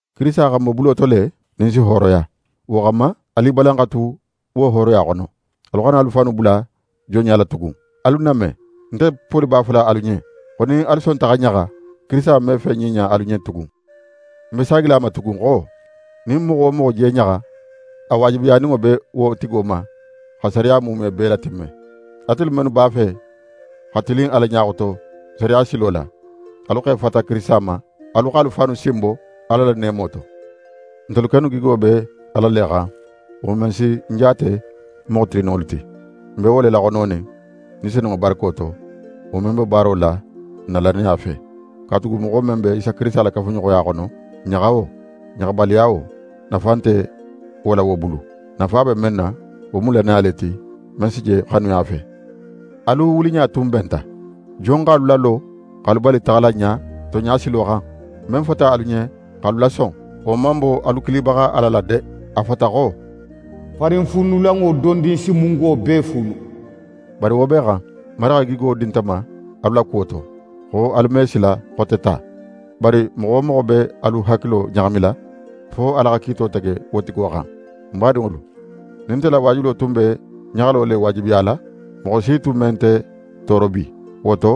Kirisita xa n bo bulo to le, nin n si hooroya. Wo xanma, alu i balan xa tu wo hooroya xono. Alu xana alu fannu bula jonɲa la tugun. Alu ń name! Nte Poli b'a fola alu ɲen, xo nin alu sonta xa ɲaxa, Kirisita me fen ɲiɲa alu ɲen tugun. Ń be saagila a ma tugun xo, nin moxo wo moxo je ɲaxa, a waajibiyaninŋo be wo tigo ma xa sariya muume bee latimme. Atelu mennu b'a fe xa tilin Ala ɲa xoto sariya silo la, alu x'e fata Kirisita ma; alu x'alu fannu sinbo Ala la neemo to. Ntelu kennu gigo be Ala le xan; wo men si ntelu jaate moxo tilinninŋolu ti. N be wo le laxononin, Ni Senunŋo barako to, wo men be baaro la n na lannaya fe. Katugu moxo men be Isa Kirisita la kafuɲoxoya xono, ɲaxa wo, ɲaxabaliya wo, nafa nte wo la wo bulu. Nafa be men na, wo mu lannaya le ti, men si je xanuya fe. Alu wuliɲa tun benta! Jon x'alu lalo x'alu bali taxala ɲa tonɲa silo xan? Men fota alu ɲen x'alu lason, wo man bo alu kilibaxa Ala la de. A fota xo: «Farinfuunulanŋo dondin si mungo bee fuunu.» Bari wo bee xan, Marigi xa gigo di nte ma alu la kuwo to, xo alu me sila xote ta. Bari moxo wo moxo be alu hakilo ɲaxamila, fo Ala xa kiito tege wo tigo xan. Ń badinŋolu, nin nte la waajulo tun be ɲaxalo le waajibiyala, moxo si tun me nte tooro bi. Wo to,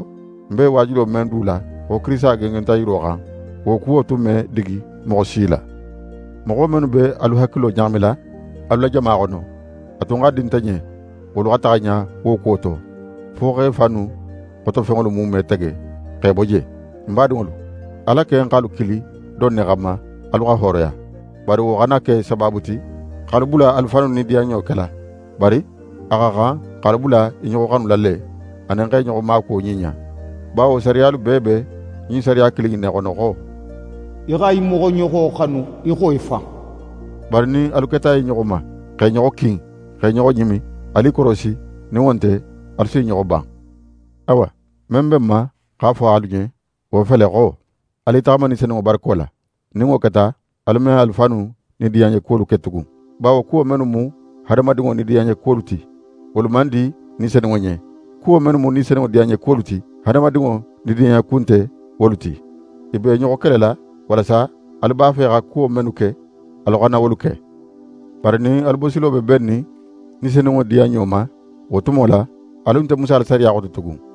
ń be waajulo men du la, xo Kirisita gengenta yiro xan, wo kuwo tun me digi moxo si la. Moxo mennu be alu hakilo ɲaxamila alu la jama xono, a tun xa di nte ɲen, wolu xa taxa ɲa wo kuwo to, fo x'e fannu xotofenŋolu muume tege x'e bo je. Ń badinŋolu, Ala ken x'alu kili don ne xanma alu xa hooroya; bari wo xana ke sabaabu ti x'alu bula alu fannu nidiyanɲo kela, bari a xa xan x'alu bula i ɲoxo xanula le, anin x'e ɲoxo maakuwo ɲiɲa. Bawo sariyalu bee be ɲin sariya kilin in ne xono xo: «Í xa í moxoɲoxo xanu í xo í fan.» Bari nin alu keta i ɲoxo ma, x'e ɲoxo kin, x'e ɲoxo ɲimi, alu i korosi, nin wo nte alu s'i ɲoxo ban. Awa, men be ń ma x'a fo alu ɲen, wo fele xo: Alu i taxama Ni Senunŋo barako la. Nin wo keta, alu me alu fannu nidiyanɲekuwolu ke tugun. Bawo kuwo mennu mu hadamadinŋo nidiyanɲekuwolu ti, wolu man di Ni Senunŋo ɲen. Kuwo mennu mu Ni Senunŋo diyanɲekuwolu ti, hadamadinŋo nidiyanɲeku nte wolu ti. I b'e ɲoxo kelela, walasa alu b'a fe xa kuwo mennu ke, alu xana wolu ke. Bari nin alu bosilo be bennin Ni Senunŋo diyanɲo ma, wo tumo la, alu nte Musa la sariya xoto tugun.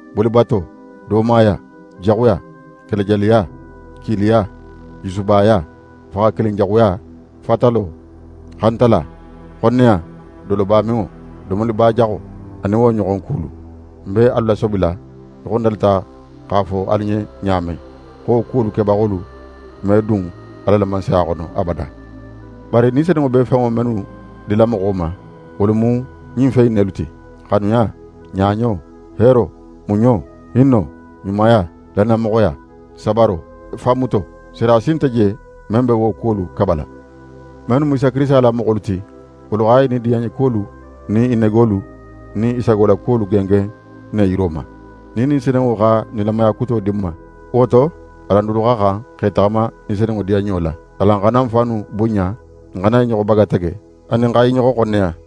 bolibato, doomaya, jaxuya, kelejaliya, kiiliya, jusubaya, faxakilinjaxuya, fatalo, xantala, xonneya, dolobaminŋo, domolibajaxo, anin wo ɲoxon kulu. Ń be alu lasobila í xo ń dalita x'a fo alu ɲen ɲa men, xo wo kuwolu kebaxolu me dun Ala la Mansaya xono abada. Bari Ni Senunŋo be fenŋo mennu dila moxo ma, wolu mu ɲin fen in nelu ti: Xanuya, ɲaɲo, heero, muɲo, hinno, ɲumaya, lannamoxoya, sabaro, fanmuto. Sariya si nte je, men be wo kuwolu kabala. Mennu mu Isa Kirisita la moxolu ti, wolu xa i nidiyanɲekuwolu nin i negolu nin i sagolakuwolu gengen ne yiro ma. Nin Ni Senunŋo xa nilamaya kuto di n ma, wo to, alan dulu xa xan x'e taxama Ni Senunŋo diyanɲo la. Alan xana n fannu bunɲa, n xana i ɲoxo bagatege, anin xa i ɲoxo xonneya.